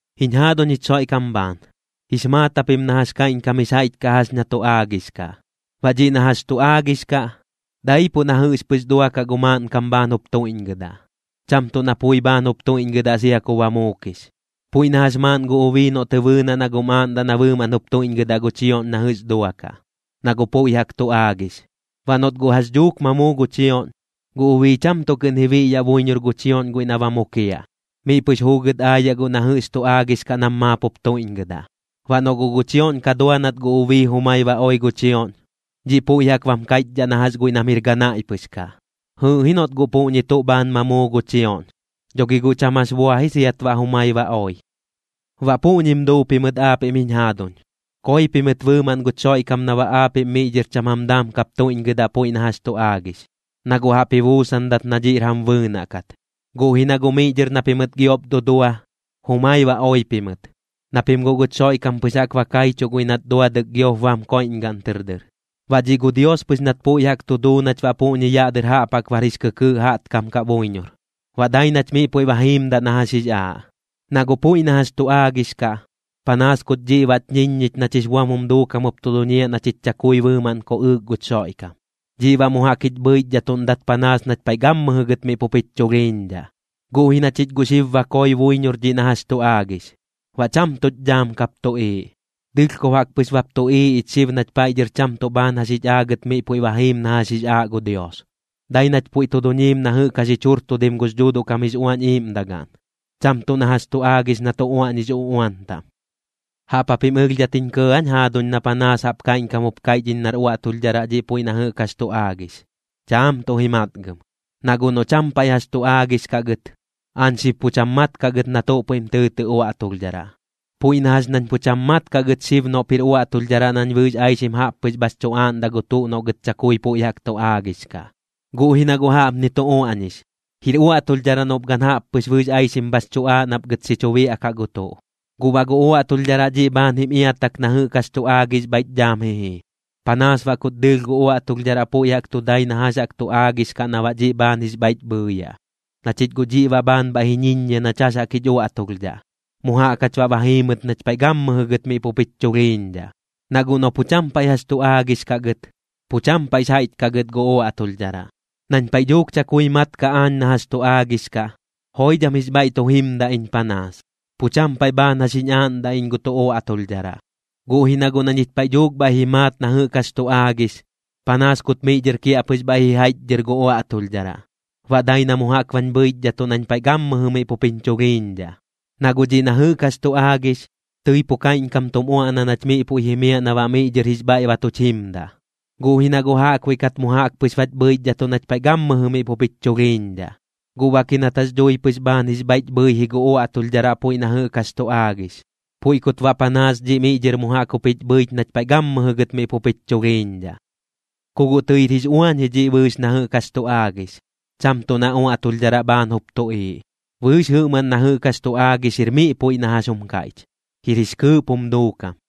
Jiñ jaaduñ jich Xoiꞌkam bhaan, jix maat japim na jax kaiꞌñkam jix jaiꞌch kaꞌ jax na tu aagix kaꞌ. Baꞌ dhiꞌ na jax tu aagix kaꞌ, daipuꞌ na jɨꞌx pɨx duakaꞌ gu maaꞌnkam bhaan jup tuiꞌñgɨdaꞌ, cham tuꞌ na pui bhaan jup tuiꞌñgɨdaꞌ sia ku ba muukix. Puiꞌ na jax maaꞌn gu ubii noꞌ tɨ bɨɨnaꞌ na guꞌm aaꞌndaꞌ na bɨɨmaꞌn jup tuiꞌñgɨdaꞌ gu chioꞌñ na jɨꞌx duakaꞌ, na guꞌ puiꞌ jaꞌk tu aagix. Baꞌ noꞌt guꞌ jax dhuukat ma muu gu chioꞌñ, gu ubii cham tuꞌ kɨꞌn ji biꞌyaꞌ buiñor gu chioꞌñ guiꞌ na ba mukiaꞌ, miꞌ pɨx juugɨt aayaꞌ guꞌ na jɨꞌx tu aagix kaꞌ nam maap jup tuiꞌñgɨdaꞌ. Baꞌ noꞌ guꞌ gu chioꞌñ ka dua nat gu ubii jumai ba oi gu chioꞌñ, dhiꞌ puiꞌ jaꞌk bam kaiꞌchdhaꞌ na jax guiꞌ nam jir ganaiꞌ pɨx kaꞌ. Jɨɨꞌ ji noꞌt guꞌ puꞌñi tuꞌ bhaan ma muu gu chioꞌñ, dho gi guꞌ cham jax bua ji siat baꞌ jumai ba oi. Baꞌ puꞌñim duu pimɨt aapiꞌm jiñ jaaduñ, koi pimɨt bɨɨmaꞌn guch Xoiꞌkam na baꞌ aapiꞌm miꞌ dhɨr cham jam daam kap tuiꞌñgɨdaꞌ puiꞌ na jax tu aagix, na guꞌ jaꞌp ji buusandat na dhiꞌr jam bɨɨnaꞌ kat. Guꞌ ji na guꞌ miꞌ dhɨr na pimɨt giop dudua, jumai ba oi pimɨt, na pim guꞌ guch Xoiꞌkam pɨx jaꞌk ba kaichuꞌ guiꞌ nat duadɨk giop bam koiꞌñgaꞌn tɨr dɨr. Baꞌ dhiꞌ gu Dios pɨx nat puiꞌ jaꞌk tu duu nach baꞌ puꞌñi yaꞌ dɨr jaꞌp jaꞌk bar jix kɨkɨɨꞌ jaꞌtkam kaꞌ buiñor, baꞌ dai nach miꞌ puiꞌ ba jiimdaꞌ na jax jix aaꞌ. Na guꞌ puiꞌ na jax tu aagix kaꞌ, panaas kut dhiꞌ baꞌch ñiññich nach jix buam jum duukam jup tu duñiaꞌ na chich chakui bɨɨmaꞌn koꞌɨɨk guch Xoiꞌkam. Dhiꞌ baꞌ mu jaꞌk jich bhɨichdhatuꞌndat panaas nach paiꞌ gammɨjɨ gɨt miꞌ pup jich chulhiiñdhaꞌ. Guꞌ ji na chich guꞌ xib ba koi buiñor dhiꞌ na jax tu aagix, baꞌ cham tuꞌch dhaam kap tuꞌiiꞌ. Dɨlhkob jaꞌk pɨx bap tuꞌiiꞌ ich xib nach paiꞌ dhɨr cham tuꞌ bhaan jax jich aagɨt miꞌ puiꞌ ba jiim na jax jix aaꞌ gu Dios. Dai nach puiꞌ tu duñiim na jɨꞌk jax jich jurtudim gux Dhuuduꞌ kam jix Uañ Iiꞌmdagaꞌn, cham tuꞌ na jax chu aagix na tu uaꞌñix uꞌuan taꞌm. ¿Jaꞌp japim ɨlhdhat jiñ kɇɇ aañ jaaduñ na panaas jaꞌp kaiꞌñkam jup kaiꞌch iñ nar uaꞌtulhdharaꞌ dhiꞌ puiꞌ na jɨꞌk jax tu aagix? Chaam tuꞌ ji matgɨm. Na guꞌ noꞌ cham paiꞌ jax tu aagix kaꞌ gɨt, aañ xib pu cham mat kaꞌ gɨt na tuꞌ puiꞌm tɨɨtɨꞌ uaꞌtulhdharaꞌ. Puiꞌ na jax nañ pu cham mat kaꞌ gɨt xib noꞌp jir uaꞌtulhdharaꞌ nañ bɨɨx aixim jaꞌp pɨx bhax chu aaꞌndaꞌ gu tuꞌ noꞌ gɨt chakui puiꞌ jaꞌk tu aagix kaꞌ. Guꞌ ji na guꞌ jaꞌpni tu uaꞌñix: “Jir uaꞌtulhdharaꞌ noꞌp gan jaꞌp pɨx bɨɨx aixim bhax chu aaꞌ nap gɨt xi chu biaꞌkaꞌ gu tuꞌ.” Guꞌ baꞌ gu uaꞌtulhdharaꞌ dhiꞌ bhaan jim iatak na jɨꞌk jax tu aagix bhaiꞌch dhaam ji jii, panaas baꞌ kut dɨɨlh gu uaꞌtulhdharaꞌ puiꞌ jaꞌk tu dai na jax jaꞌk tu aagix kaꞌ na baꞌ dhiꞌ bhaan jix bhaiꞌch bhɨɨyaꞌ. Na chich guꞌ dhiꞌ baꞌ bhaan bhaiꞌ ji ñiññia nach jax jaꞌk jich uaꞌtulhdhaꞌ, mu jaꞌk jach baꞌ ba jiimɨt nach paiꞌ gammɨjɨ gɨt miꞌ pup jich chulhiiñdhaꞌ. Na guꞌ noꞌ pu cham paiꞌ jax tu aagix kaꞌ gɨt, pu cham paiꞌx jaiꞌch kaꞌ gɨt gu uaꞌtulhdharaꞌ. Nañ paiꞌ dhuuk chakui mat kaꞌ aañ na jax tu aagix kaꞌ, joidham jix bhaiꞌ tu jimdaꞌ iñ panaas, pu cham paiꞌ bhaan jax jiñ aaꞌndaꞌ iñ gu tuꞌ uaꞌtulhdharaꞌ. Guꞌ ji na guꞌ na ñich paiꞌ dhuuk bhaiꞌ ji maat na jɨꞌk jax tu aagix, panaas kut miꞌ dhɨr kiaꞌpɨx bhaiꞌ ji jaiꞌchdhɨr gu uaꞌtulhdharaꞌ, baꞌ dai na mu jaꞌk bañ bhɨichdhatuꞌ nañ paiꞌ gammɨjɨ miꞌ pup jiñ chulhiiñdhaꞌ. Na guꞌ dhiꞌ na jɨꞌk jax tu aagix, tɨi pu kaiꞌñkam tum uaꞌna nach miꞌ puiꞌ jimiaꞌ na baꞌ miꞌ dhɨr jix bhaiꞌ ba tuch jimdaꞌ, guꞌ ji na guꞌ jaꞌkbuiꞌ kat mu jaꞌk pɨx bach bhɨichdhatuꞌ nach paiꞌ gammɨjɨ miꞌ pup jich chulhiiñdhaꞌ. Guꞌ bak ji nat jax dhui pɨx bhaan jix bhaiꞌch bhɨi ji gu uaꞌtulhdharaꞌ puiꞌ na jɨꞌk jax tu aagix, puiꞌ kut baꞌ panaas dhiꞌ miꞌ dhɨr mu jaꞌk jup jich bhɨich nach paiꞌ gammɨjɨ gɨt miꞌ pup jich chulhiiñdhaꞌ. Ku guꞌ tɨir jix uañ ji dhiꞌ bɨɨx na jɨꞌk jax tu aagix, cham tuꞌ na uaꞌtulhdharaꞌ bhaan jup tuꞌiiꞌ. Bɨɨx jɨꞌmaꞌn na jɨꞌk jax tu aagix jir miꞌ puiꞌ na jax jum kaiꞌch, jir jix kɨɨꞌp jum duukam.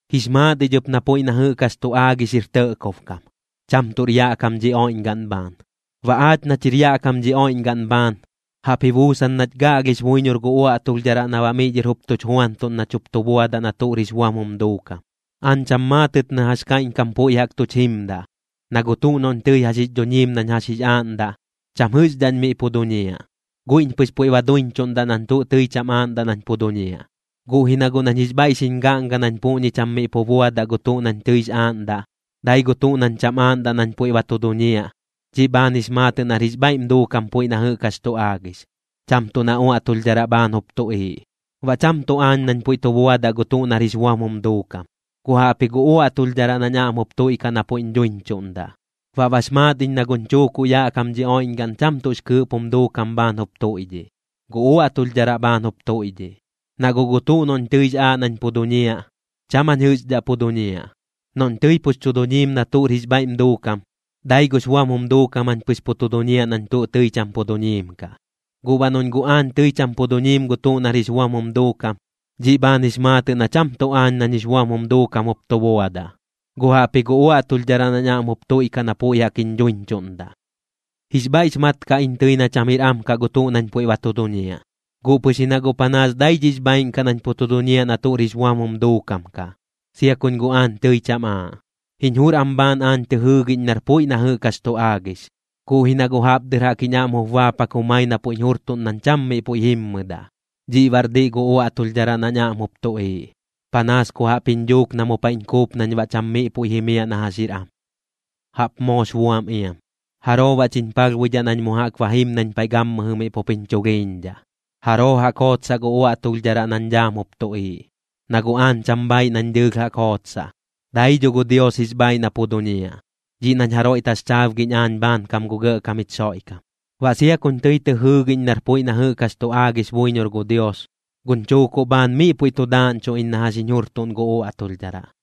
Jix maat ich ɨp na puiꞌ na jɨꞌk jax tu aagix jir tɇꞌkob kam, cham tuꞌr yaꞌ kam dhi oiꞌñgaꞌn bhaan. Baꞌ aach nach jir yaꞌ kam dhi oiꞌñgaꞌn bhaan, jaꞌp ji buusan nach gaꞌlhix buiñor gu uaꞌtulhdharaꞌ na baꞌ miꞌ dhɨr jup tuch juantuꞌn nach jup tu buadaꞌ na tuꞌr jix buam jum duukam. Aañ cham maatɨt na jax kaiꞌñkam puiꞌ jaꞌk tuch jimdaꞌ, na gu tuꞌ noꞌñ tɨi jax jix dhuñiim nañ jax jix aaꞌndaꞌ, cham jɨꞌxdhaꞌñ miꞌ pu duñiaꞌ, guiꞌñ pɨx puiꞌ ba duiñchuꞌndaꞌ nañ tuꞌ tɨi cham aaꞌndaꞌ nañ pu duñiaꞌ. Guꞌ ji na guꞌ nañ jix bhaiꞌ xiñ gaꞌnga nañ puꞌñi cham tuꞌ miꞌ pu buadaꞌ gu tuꞌ nañ tɨix aaꞌndaꞌ, dai gu tuꞌ nañ cham aaꞌndaꞌ nañ puiꞌ ba tu duñiaꞌ, dhiꞌ bhaan jix maatɨꞌ nar jix bhaiꞌm duukam puiꞌ na jɨꞌk jax tu aagix, cham tuꞌ na uaꞌtulhdharaꞌ bhaan jup tuꞌiiꞌ. Baꞌ cham tuꞌ aañ nañ puiꞌ tu buadaꞌ gu tuꞌ nar jix buam jum duukam, guꞌ jaꞌpji gu uaꞌtulhdharaꞌ nañ aꞌm jup tuiꞌkaꞌ na puiꞌñ dhuiñchuꞌndaꞌ. Baꞌ bax maat iñ na guñ chuukuꞌ yaꞌ kam dhi oiꞌñgaꞌn cham tuꞌx kɨɨꞌp jum duukam bhaan jup tuiꞌdhiꞌ, gu uaꞌtulhdharaꞌ bhaan jup tuiꞌdhiꞌ. Na guꞌ gu tuꞌ noꞌñ tɨix aaꞌ nañ pu duñiaꞌ, cham jañ jɨꞌxdhaꞌ pu duñiaꞌ. Noꞌñ tɨi pux chu duñiim na tuꞌr jix bhaiꞌm duukam, dai gux buam jum duukam jañ pɨx pu tu duñiaꞌ nañ tuꞌ tɨi cham pu duñiim kaꞌ. Guꞌ baꞌ noꞌñ guꞌ aañ tɨi cham pu duñiim gu tuꞌ nar jix buam jum duukam, dhiꞌ bhaan jix maatɨꞌ na cham tuꞌ aañ nañ jix buam jum duukam jup tu buadaꞌ, guꞌ jaꞌpji gu uaꞌtulhdharaꞌ nañ aꞌm jup tuiꞌkaꞌ na puiꞌ jaꞌk jiñ dhuiñchuꞌndaꞌ. Jix bhaiꞌx mat kaꞌ iñ tɨi na cham jir am kaꞌ gu tuꞌ nañ puiꞌ ba tu duñiaꞌ, guꞌ pɨx ji na guꞌ panaas dai dhiꞌx bhaaiꞌn kaꞌ nañ pu tu duñiaꞌ na tuꞌr jix buam jum duukam kaꞌ, sia kuñ guꞌ aañ tɨi cham aaꞌ. Jiñ jur am bhaan aañ tɨ jɨɨgiꞌñ nar am puiꞌ na jɨꞌk jax tu aagix, guꞌ ji na guꞌ jaꞌp dɨr jaꞌk jiñ aꞌm jup baapak jumai na puiꞌñ jurtuꞌn nañ cham miꞌ puiꞌ jimmɨdaꞌ. Dhiꞌ baꞌr diꞌ gu uaꞌtulhdharaꞌ nañ aꞌm jup tuꞌiiꞌ, panaas ku jaꞌp jiñ dhuuk na mu paiꞌñ kuup nañ baꞌ cham miꞌ puiꞌ jimiaꞌ na jax jir am. Jaꞌp moox buam iam. ¿Jaroo baꞌ chiñ palhbuidhaꞌ nañ mu jaꞌk ba jim nañ paiꞌ gammɨjɨ miꞌ pup jiñ chulhiiñdhaꞌ? ¿Jaroo jaꞌk jootsaꞌ gu uaꞌtulhdharaꞌ nañ dhaam jup tuꞌiiꞌ? Na guꞌ aañ cham bhaaiꞌ nañ dɨɨlh jaꞌk jootsaꞌ. Dai dho gu Dios jix bhaaiꞌ na pu duñiaꞌ, dhiꞌ nañ jaroiꞌ taxchaabgiꞌñ aañ bhaankam gu Gɇꞌkam jich Xoiꞌkam. Baꞌ sia kuñ tɨi tɨ jɨɨgiꞌñ nar puiꞌ na jɨꞌk jax tu aagix buiñor gu Dios, guñ chuukuꞌ bhaan miꞌ puiꞌ tu daaꞌñchuꞌ iñ na jax jiñ jurtuꞌn gu uaꞌtulhdharaꞌ.